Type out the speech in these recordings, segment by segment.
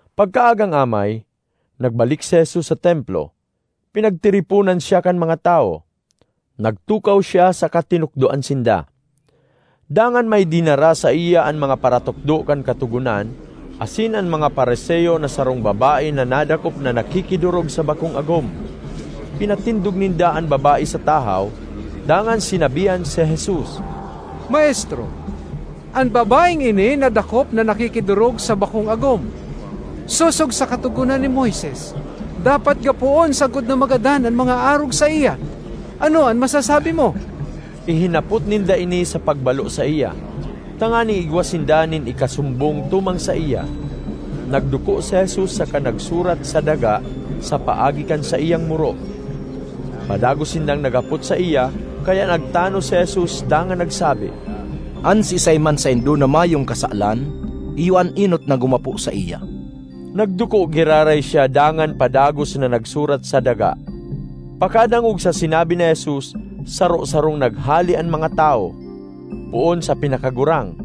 Pagkaagang amay, nagbalik si Jesus sa Templo. Pinagtiriponan siya kan mga tawo; nagtukaw siya saka tinukdoan sinda. Dangan may dinara saiya an mga paratukdo kan Katogonan asin an mga Fariseo na sarong babae na nadakop na nakikidorog sa bakong agom. Pinatindog ninda an babae sa tahaw, dangan sinabihan si Jesus, “Maestro, an babaeng ini nadakop na nakikidorog sa bakong agom. Sosog sa Katogonan ni Moises, dapat gapoon sagkod na magadan an mga arog saiya. Ano an masasabi mo?” Ihinapot ninda ini sa pagbalo saiya, tanganing igwa sinda nin ikasumbong tumang saiya. Nagduko si Jesus saka nagsurat sa daga sa paagi kan saiyang muro. Padagos sindang naghapot saiya, kaya nagtanos si Jesus dangan nagsabi, “An siisay man saindo na mayong kasalan, iyo an enot na gumapo saiya.” Nagduko giraray siya dangan padagos na nagsurat sa daga. Pagkadangog sa sinabi ni Jesus, saro-sarong naghale an mga tawo, poon sa pinakagurang.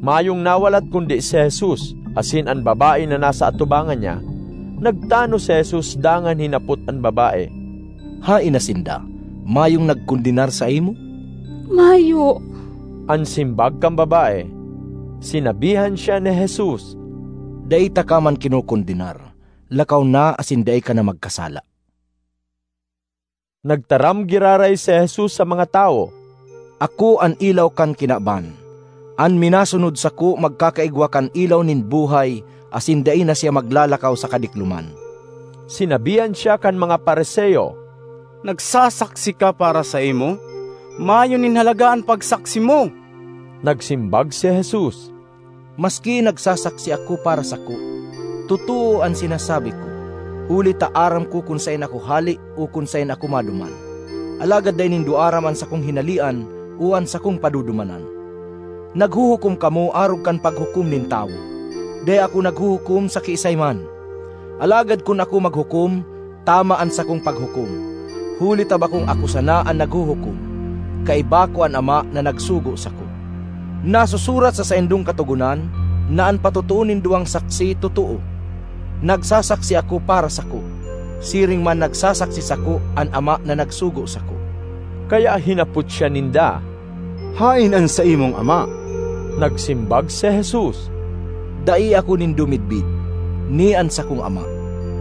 Mayong nawalat kundi si Jesus asin an babae na nasa atubangan niya. Nagtanos si Jesus dangan hinapot an babae, “Haen na sinda? Mayong nagkondenar saimo?” ”Mayo,” an simbag kan babae. Sinabihan siya ni Jesus, “Dai taka man kinokondenar. Lakaw na asin dai ka na magkasala.”] Nagtaram giraray si Jesus sa mga tawo, “Ako an ilaw kan kinaban. An minasunod sako magkakaigwa kan ilaw nin buhay asin dai na siya maglalakaw sa kadikloman.” Sinabihan siya kan mga Fariseo, “Nagsasaksi ka para saimo; mayo nin halaga an pagsaksi mo.” Nagsimbag si Jesus, “Maski nagsasaksi ako para sako, totoo an sinasabi ko, huli ta aram ko kun saen ako hale o kun saen ako maduman. Alagad dai nindo aram an sakong hinalean o an sakong padudumanan. Naghuhukom kamo arog kan paghukom nin tawo. Dai ako naghuhukom sa kiisay man. Alagad kun ako maghukom, tama an sakong paghukom, huli ta bakong ako sana an naghuhukom; kaiba ko an Ama na nagsugo sako. Nasusurat sa saindong Katogonan na an patotoo nin duwang saksi, totoo. Nagsasaksi ako para sako; siring man nagsasaksi sako an Ama na nagsugo sako.” Kaya hinapot siya ninda, “Haen an saimong ama?” Nagsimbag si Jesus, “Dai ako nindo midbid, ni an sakong Ama.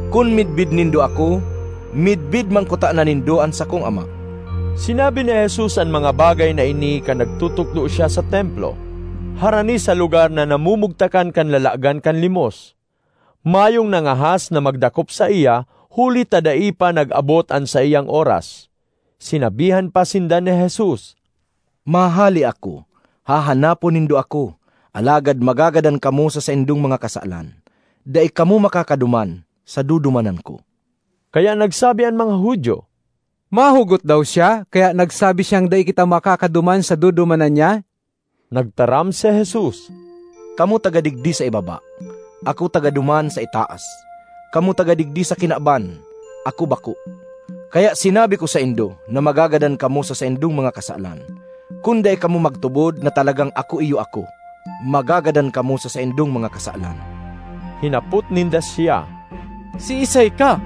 Kun midbid nindo ako, midbid man kutana nindo an sakong Ama.” Sinabi ni Jesus an mga bagay na ini kan nagtutukdo siya sa Templo, harani sa lugar na namumugtakan kan lalagan kan limos. Mayong nangahas na magdakop saiya, huli ta dai pa nag-abot an saiyang oras. Sinabihan pa sinda ni Jesus, “Mahale ako; hahanapon nindo ako, alagad magagadan kamo sa saindong mga kasalan. Dai kamo makakaduman sa dudumanan ko.” Kaya nagsabi an mga Judio, “Mahugot daw siya, kaya nagsabi siyang dai kita makakaduman sa dudumanan niya?” Nagtaram si Jesus, “Kamo taga digdi sa ibaba; ako taga duman sa itaas. Kamo taga digdi sa kinaban; ako bako. Kaya sinabi ko saindo na magagadan kamo sa saindong mga kasalan. Kun dai kamo magtubod na talagang ‘Ako Iyo Ako,’ magagadan kamo sa saindong mga kasalan.” Hinapot ninda siya, “Siisay ka?”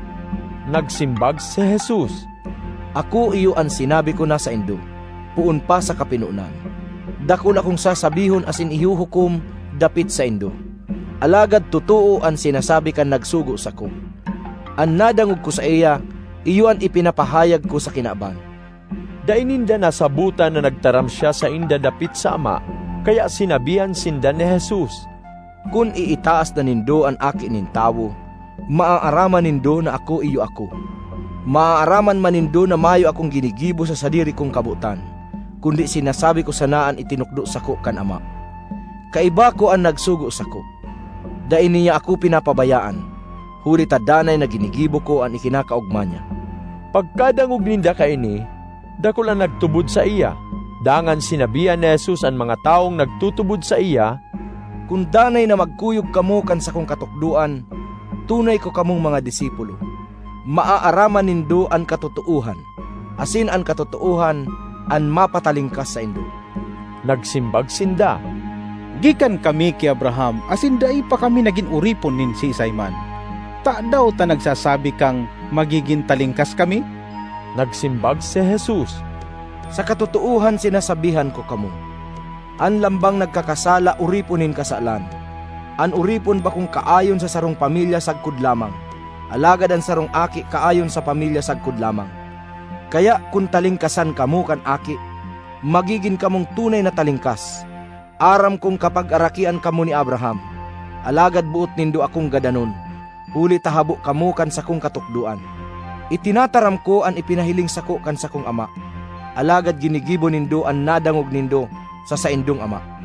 Nagsimbag si Jesus, “Ako iyo an sinabi ko na saindo poon pa sa kapinonan. Dakul akong sasabihon asin ihuhukom dapit saindo. Alagad totoo an sinasabi kan nagsugo sako. An nadangog ko saiya iyo an ipinapahayag ko sa kinaban.” Dai ninda nasabotan na nagtaram siya sainda dapit sa Ama. Kaya sinabihan sinda ni Jesus, “Kun iitaas na nindo an Aki nin Tawo, maaaraman nindo na ‘Ako Iyo Ako’; maaaraman man nindo na mayo akong ginigibo sa sadiri kong kabotan; kundi sinasabi ko sana an itinukdo sako kan Ama. Kaiba ko an nagsugo sako; dai niya ako pinapabayaan; huli ta danay na ginigibo ko an ikinakaogma niya.” Pagkadangog ninda kaini, dakul an nagtubod saiya. Dangan sinabihan ni Jesus an mga tawong nagtutubod saiya, “Kun danay na magkuyog kamo kan sakong katukdoan, tunay ko kamong mga disipulo; maaaraman nindo an katotoohan, asin an katotoohan an mapatalingkas saindo.” Nagsimbag sinda, “Gikan kami ki Abraham asin dai pa kami nagin oripon nin siisay man. Tadaw ta nagsasabi kang magigin talingkas kami?” Nagsimbag si Jesus, “Sa katotoohan sinasabihan ko kamo, an lambang nagkakasala oripon nin kasalan. An oripon bakong kaayon sa sarong pamilya sagkod lamang, alagad an sarong aki kaayon sa pamilya sagkod lamang. Kaya kun talingkasan kamo kan Aki, magigin kamong tunay na talingkas. Aram kong kapagarakian kamo ni Abraham. Alagad boot nindo akong gadanon, huli ta habo kamo kan sakong katukdoan. Itinataram ko an ipinahiling sako kan sakong Ama; alagad ginigibo nindo an nadangog nindo sa saindong ama.”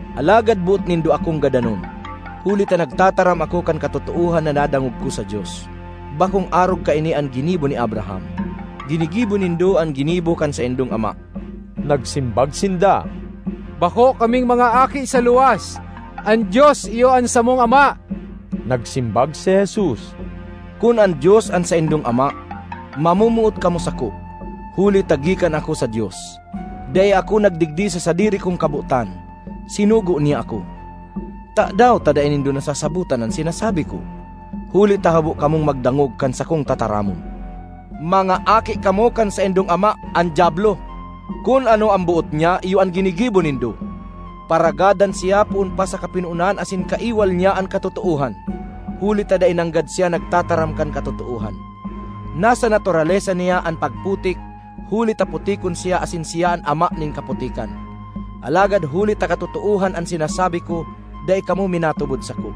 ”Alagad boot nindo akong gadanon, huli ta nagtataram ako kan katotoohan na nadangog ko sa Dios. Bakong arog kaini an ginibo ni Abraham. Ginigibo nindo an ginibo kan saindong ama.” Nagsimbag sinda, “Bako kaming mga aki sa luwas. An Dios iyo an samong Ama.” Nagsimbag si Jesus, “Kun an Dios an saindong Ama, mamomoot kamo sako, huli ta gikan ako sa Dios. Dai ako nagdigdi sa sadiri kong kabotan; sinugo niya ako. Tadaw ta dai nindo nasasabotan an sinasabi ko? Huli ta habo kamong magdangog kan sakong tataramon. Mga aki kamo kan saindong ama, an Diablo; kun ano an boot niya iyo an ginigibo nindo. Paragadan siya poon pa sa kapinonan asin kaiwal niya an katotoohan, huli ta dai nanggad siya nagtataram kan katotoohan. Nasa naturalesa niya an pagputik huli ta putikon siya asin siya an ama nin kaputikan. Alagad huli ta katotoohan an sinasabi ko, dai kamo minatubod sako.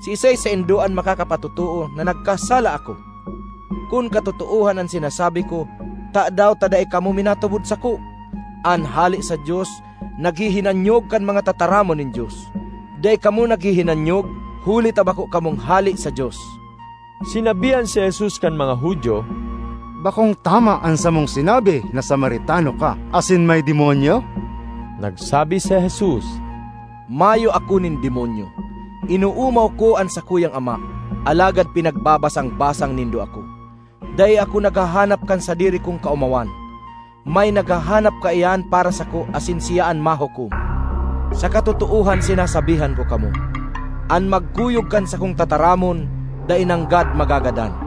Siisay saindo an makakapatotoo na nagkasala ako? Kun katotoohan an sinasabi ko, tadaw ta dai kamo minatubod sako? An hale sa Dios naghihinanyog kan mga tataramon nin Dios; dai kamo naghihinanyog, huli ta bako kamong hale sa Dios.” Sinabihan si Jesus kan mga Judio, “Bakong tama an samong sinabi na Samaritano ka asin may demonyo?” Nagsabi si Jesus, “Mayo ako nin demonyo. Inoomaw ko an sakuyang Ama, alagad pinagbabasang-basang nindo ako. Dai ako naghahanap kan sadiri kong kaomawan. May naghahanap kaiyan para sako asin siya an mahukom. Sa katotoohan sinasabihan ko kamo, an magkuyog kan sakong tataramon dai nanggad magagadan.”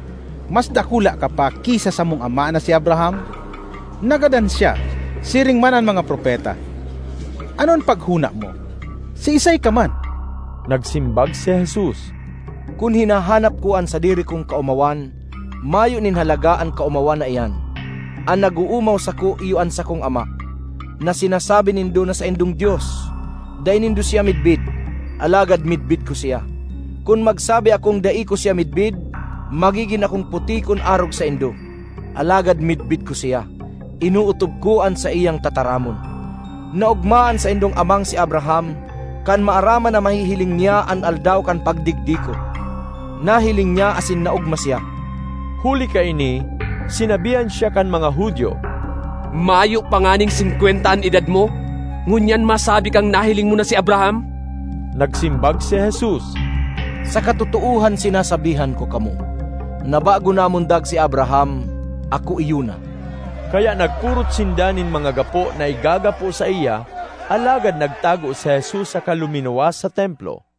Mas dakula ka pa ki sa samong ama na si Abraham? Nagadan siya, siring man an mga propeta. Ano an paghona mo, siisay ka man?” Nagsimbag si Jesus, “Kun hinahanap ko an sadiri kong kaomawan, mayo nin halaga an kaomawan na iyan. An nag-oomaw sako iyo an sakong Ama, na sinasabi nindo na saindong Dios. Dai nindo siya midbid, alagad midbid ko siya. Kun magsabi akong dai ko siya midbid, magigin akong putikon arog saindo. Alagad midbid ko siya; inootob ko an saiyang tataramon. Naogma an saindong amang si Abraham kan maaraman na mahihiling niya an aldaw kan pagdigdi ko; nahiling niya asin naogma siya.” Huli kaini, sinabihan siya kan mga Judio, “Mayo pa nganing singkwenta an edad mo, ngunyan masabi kang nahiling mo na si Abraham?” Nagsimbag si Jesus, “Sa katotoohan sinasabihan ko kamo, na bago namundag si Abraham, ‘Ako iyo na’.” Kaya nagpurot sinda nin mga gapo na igagapo saiya, alagad nagtago si Jesus saka luminuwas sa Templo.